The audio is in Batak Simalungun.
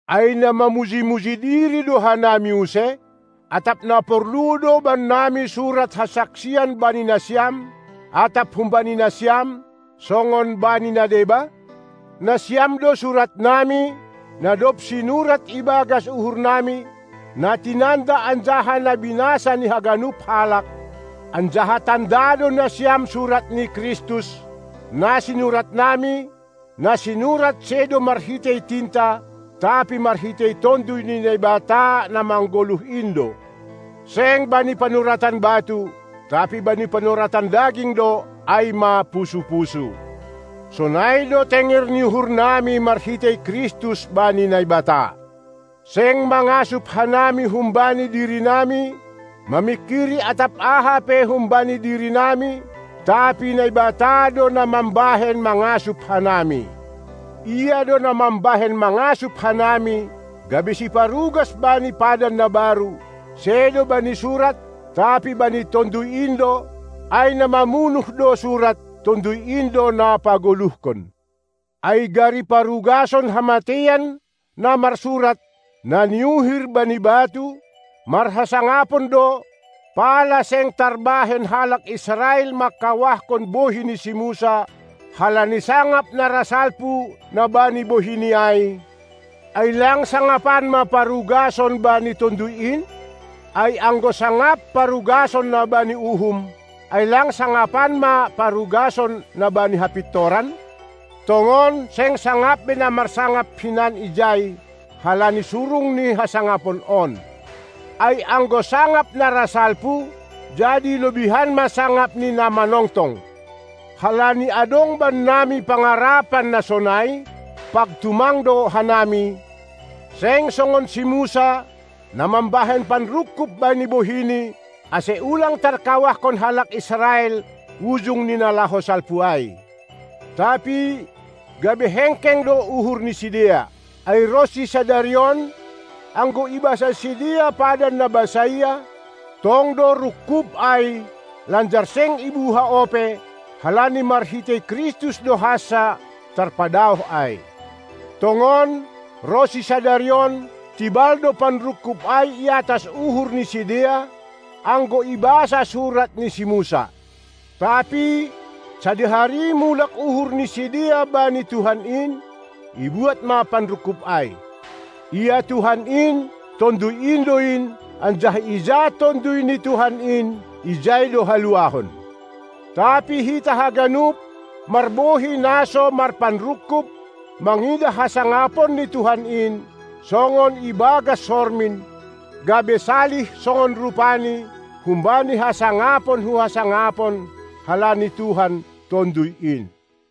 Ai na mamuji-muji diri do hanami use? Atap na porlu do bannami surat hasaksian bani nasiam atap humbani nasiam, songon bani na deba? Nasiam do suratnami, na dob sinurat ibagas uhurnami, na tinanda anjaha na binasa ni haganup halak, anjaha tanda do nasiam surat ni Kristus, na sinuratnami, na sinurat sedo marhitei tinta, tapi marhitei Tonduy ni Naibata na manggoluh in do; seng bani panuratan batu, tapi bani panuratan daging do, ai ma pusu-pusu. Sonai do tenger ni uhurnami marhitei Kristus bani Naibata. Seng mangasup hanami humbani dirinami, mamingkiri atap aha pe humbani dirinami, tapi Naibata do na mambahen mangasup hanami. Ia do na mambahen mangasup hanami, gabe siparugas bani padan na baru, sedo bani surat, tapi bani Tonduy in do; ai na mamunuh do surat, Tonduy in do na pagoluhkon. Ai gari parugason hamateian, na marsurat, na niuhir bani batu, marhasangapon do, pala seng tarbahen halak Israel mangkawahkon bohi ni si Musa halani sangap na ra salpu, na bani bohini ai, ai lang sangapan ma parugason bani Tonduy in? Ai anggo sangap parugason na bani uhum, ai lang sangapan ma parugason na bani hapintoran? Tongon, seng sangap be na marsangap hinan ijai, halani surung ni hasangapon on. Ai anggo sangap na ra salpu, jadi lobihan ma sangap ni na manongtong. Halani adong bannami pangarapan na sonai, pag tumang do hanami, seng songon si Musa, na mambahen panrungkub bani bohini, ase ulang tarkawahkon halak Israel ujung ni na laho salpu ai. Tapi gabe hengkeng do uhur ni sidea. Ai ronsi sadari on, anggo ibasa sidea padan na basaia, tong do rungkub ai; lanjar seng ibuha ope, halani marhitei Kristus do hansa tarpadaoh ai. Tongon, ronsi sadari on, tibal do panrungkub ai iatas uhurni sidea, anggo ibasa surat ni si Musa. Tapi sadihari mulak uhur ni sidea bani Tuhan in, ibuat ma panrungkub ai. Ia Tuhan in Tonduy in do in; anjaha ija Tonduy ni Tuhan in, ijai do haluahon. Tapi hita haganup, marbohi na so marpanrungkub, mangidah hasangapon ni Tuhan in, songon ibagas sormin, gabe salih songon rupaNi, humbani hasangapon hu hasangapon, halani Tuhan, Tonduy in.